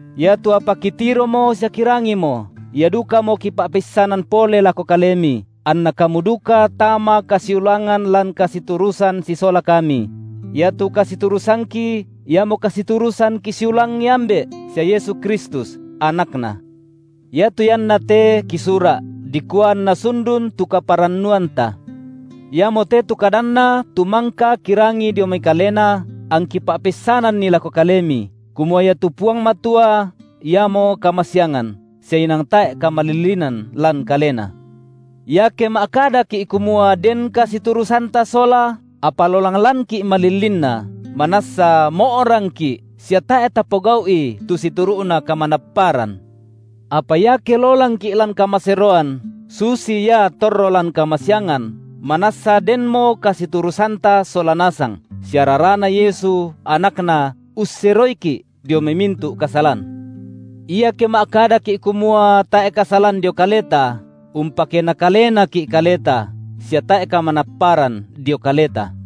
iatu apa kitiromo sia kirangimo, ia dukamo kipa’peissanan pole lako kalemi, anna kamu duka tama kasiulangan lan kasiturusan sisola kami; iatu kasiturusangki iamo kasiturusan kisiulangi Ambe’ sia Yesu Kristus, AnakNa. Iatu iannate kisura’, dikua anna sundun tu kaparannuanta. Iamote tu kadanNa tu mangka kirangi dio mai Kalena, angki pa’peissananni lako kalemi, kumua iatu Puang Matua Iamo kamasiangan, sia inang tae’ kamalillinan lan Kalena. Iake ma’kadaki’ kumua den kasiturusanta sola, apa lolang lanki’ malillinna, manassa mo’rangki’ sia tae’ tapogau’i tu situru’na kamanapparan. Apa iake lolangki’ lan kamaseroan, susi Ia torro lan kamasiangan, manassa denmo kasiturusanta sola nasang, sia raraNa Yesu, AnakNa, usseroiki’ dio mai mintu’ kasalan. Iake ma’kadaki’ kumua tae’ kasalan dio kaleta, umpakena kalenaki’ kaleta sia tae’ kamanapparan dio kaleta.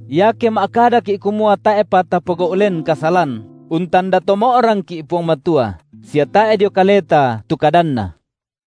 Iake ma’kadaki’ kumua tae’pa tapogau’ len kasalan, untanda to mo’rangki’ Puang Matua, sia tae’ dio kaleta tu kadanNa.